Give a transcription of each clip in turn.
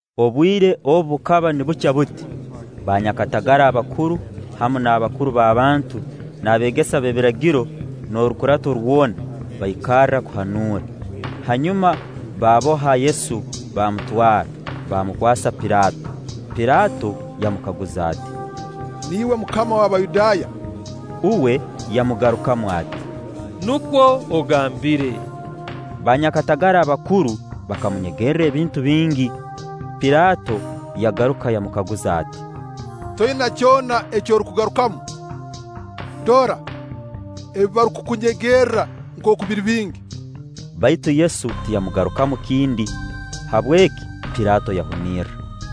Obwire obu bukaba nibukya buti, baanyakatagara abakuru, hamu n'abakuru b'abantu, n'abeegesa b'ebiragiro, n'orukurato rwona baikarra kuhanuura; hanyuma baaboha Yesu baamutwara, baamukwasa Pilaato. Pilaato yamukaguza ati: “Niiwe Mukama w'Abayudaaya?” Uwe yamugarukamu ati: “Nukwo ogambire.” Baanyakatagara abakuru bakamunyegerra ebintu bingi. Pilaato yagaruka yamukaguza ati: “Toina kyona eki orukugarukamu? Dora, ebi barukukunyegerra nkooku biri bingi.” Baitu Yesu tiyamugarukamu kindi; habweki Pilaato yahunirra.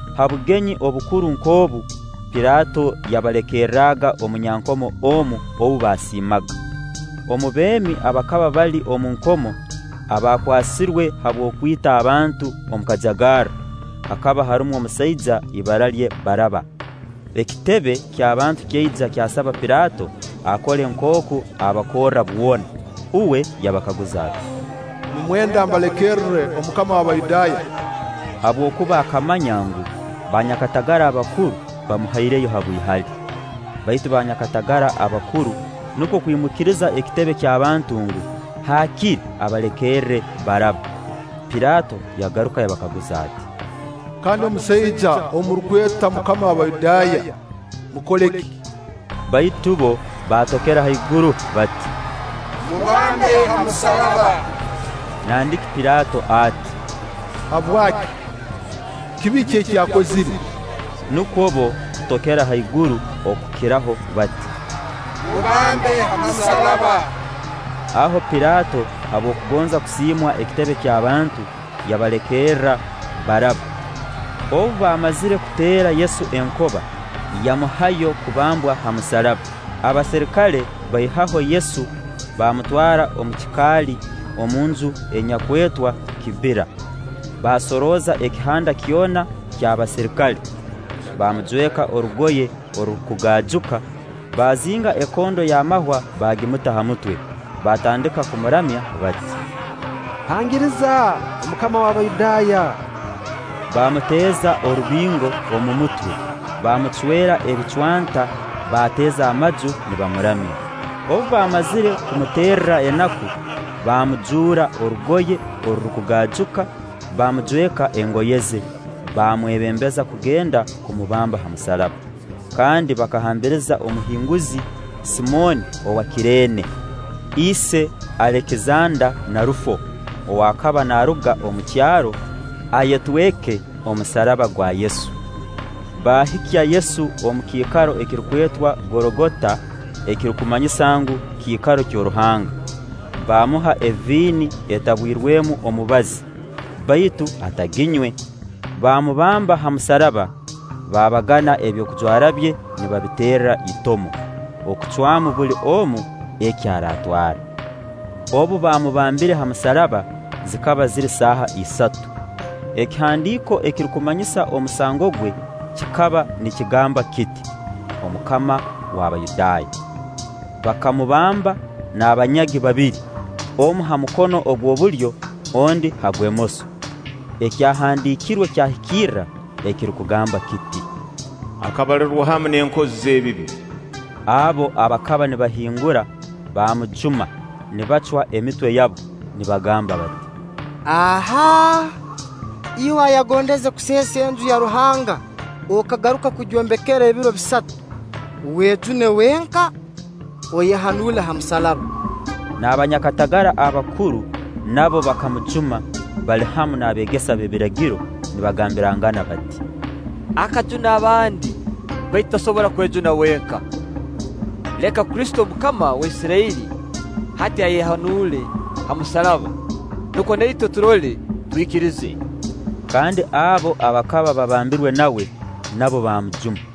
Ha bugenyi obukuru nk'obu Pilaato yabalekerraga omunyankomo omu ou baasiimaga. Omu beemi abakaba bali omu nkomo abaakwasirwe habw'okwita abantu omu kajagarro, hakaba harumu omusaija ibara lye Baraaba. Ekitebe ky'abantu kyaija kyasaba Pilaato akole nkooku abakorra bwona. Uwe yabakaguza ati: “Nimwenda mbalekerre Omukama w'Abayudaaya?” Habwokuba akamanya ngu, banyakatagara abakuru bamuhaireyo habw'ihali. Baitu banyakatagara abakuru nukwo kwimukiriza ekitebe ky'abantu ngu, haakire abalekerre Baraaba. Pilaato yagaruka yabakaguza ati: “Kandi omusaija ou murukweta Mukama w'Abayudaaya, mmukole ki?” Baitu bbo baatokera haiguru bati: “Mubambe ha musaraba.” Nandiki Pilaato ati: “Habwaki? Kibi ki eki akozire?” Nukwo bbo kutokera haiguru okukiraho bati: “Mubambe ha musaraba.” Aho Pilaato habw'okugonza kusiimwa ekitebe ky'abantu, yabalekerra Baraaba. Obu baamazire kuteera Yesu enkoba, yamuhayo kubambwa ha musaraba. Abaserikale baihaho Yesu baamutwara omu kikaali omunju enyakwetwa kibbira; baasorooza ekihanda kyona ky'abaserikale. Baamujweka orugoye orurukugaajuka, baazinga ekondo y'amahwa baagimuta ha mutwe. Baatandika kumuramya bati: “Hangiriza, Omukama w'Abayudaaya!” Baamuteeza orubingo omu mutwe, baamucwera ebicwanta, baateeza amaju nibamuramya. Obu baamazire kumuterra enaku, baamujuura orugoye orurukugaajuka, baamujweka engoye ze, baamwebembeza kugenda kumubamba ha musaraba. Kandi bakahambiriza omuhinguzi, Simooni owa Kireene, ise Alekisanda na Rufo, ow'akaba naaruga omu kyaro, ayetweke omusaraba gwa Yesu. Baahikya Yesu omu kiikaro ekirukwetwa Gologota (ekirukumanyisa ngu, kiikaro ky'oruhanga). Baamuha eviini etabwirwemu omubazi; baitu ataginywe. Baamubamba ha musaraba; baabagana ebyokujwara bye nibabiterra itomo, okucwamu buli omu eki araatwara. Obu baamubambire ha musaraba zikaba ziri saaha isatu. Ekihandiiko ekirukumanyisa omusango gwe kikaba nikigamba kiti: “Omukama w'Abayudaaya.” Bakamubamba n'abanyagi babiri, omu ha mukono ogw'obulyo, ondi ha gwemoso. (Ekyahandiikirwe kyahikirra ekirukugamba kiti: “Akabalirwa hamu n'enkozi z'ebibi.”) Abo abakaba nibahingura baamujuma, nibacwa emitwe yabo, nibagamba bati: “Ahaa! Iwe ayagondeze kuseesa Enju ya Ruhanga okagaruka kugyombekera ebiro bisatu, wejune wenka, oyehanuule ha musaraba!” N'abanyakatagara abakuru nabo bakamujuma bali hamu n'abeegesa b'ebiragiro nibagambirangana bati; “Akajuna abandi, baitu tasobora kwejuna wenka. Leka Kristo, Omukama wa Isirairi, hati ayehanuule ha musaraba, nukwo na itwe turole, twikirize.” Kandi abo abakaba babambirwe nawe, nabo baamujuma.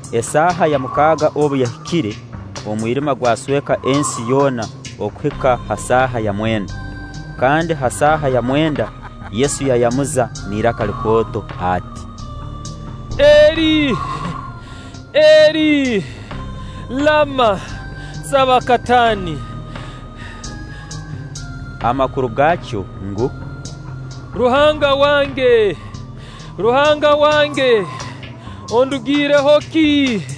Esaaha ya mukaaga obu yahikire, omwirima gwasweka ensi yoona okuhika ha saaha ya mwenda. kandi ha saaha ya mwenda Yesu yayamuza n'iraka likooto ati: “Eli, Eli, lama sabakatani?” amakuru gaakyo ngu: “Ruhanga wange, Ruhanga wange, ondugiireho ki?”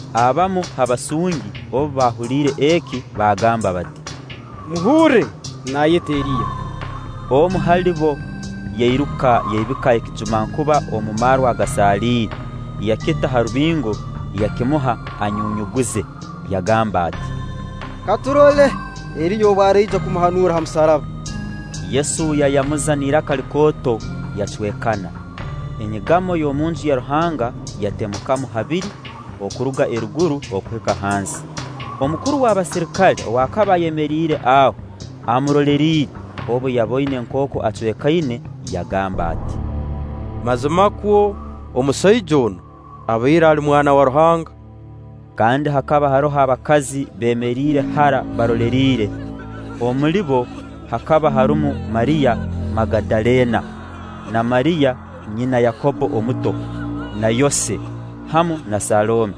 Abamu ha basungi obu baahuuliire eki baagamba bati: “Muhurre, naayeta Eriya.” Omu hali bo yairuka yaibika ekijumankuba omu marwa agasaliire, yakita ha rubingo, yakimuha anyunyuguze, yagamba ati: “Ka turole Eriya obu araija kumuhanuura ha musaraba.” Yesu yayamuza n'iraka likooto, yacwekana. Enyigamo y'omu Nju ya Ruhanga yatemukamu habiri, okuruga eruguru okuhika hansi. Omukuru w'abaserikale ow'akaba ayemeriire aho amuroleriire, obu yaboine nkooku acwekaine, yagamba ati: “Mazimakwo, omusaija onu abaire ali Mwana wa Ruhanga!” Kandi hakaba haroho abakazi beemeriire hara baroleriire. Omuli bo hakaba harumu Mariya Magadaleena, na Mariya nyina Yakobbo omuto, na Yose, hamu na Salome.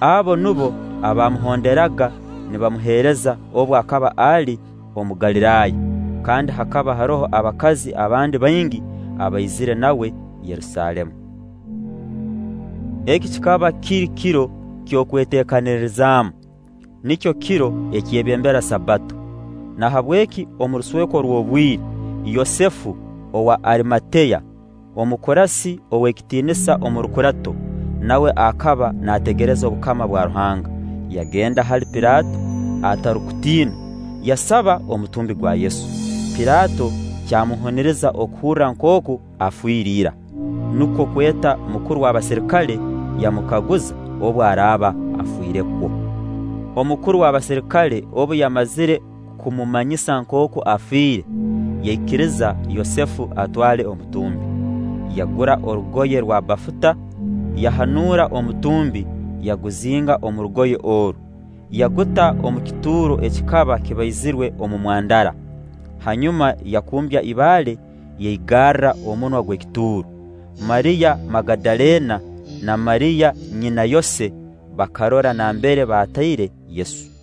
Abo nubo abaamuhonderaga nibamuheereza obu akaba ali omu Galiraaya; kandi hakaba haroho abakazi abandi baingi abaizire nawe Yerusaalemu. Eki kikaba kiri kiro eky'Okweteekanirizaamu, nikyo kiro ekyebembera Sabbato. Nahabweki omu rusweko rw'obwire, Yosefu owa Arimateya, omukurasi ow'ekitiinisa omu rukurato, nawe akaba naategereza obukama bwa Ruhanga, yagenda hali Pilaato atarukutiina, yasaba omutumbi gwa Yesu. Pilaato, kyamuhuniriza okuhurra nkooku afire ira, nukwo kweta mukuru w'abaserikale, yamukaguza obu araaba afiirekwo. Omukuru w'abaserikale obu yamazire kumumanyisa nkooku afiire, yaikiriza Yosefu atwale omutumbi. Yagura orugoye rwa bafuta, yahanuura omutumbi, yaguzinga omu rugoye oru, yaguta omu kituuro ekikaba kibaizirwe omu mwandara. Hanyuma yakumbya ibaale, yaigarra omunwa gw'ekituuro. Mariya Magadaleena na Mariya nyina Yose bakarora nambere bataire Yesu.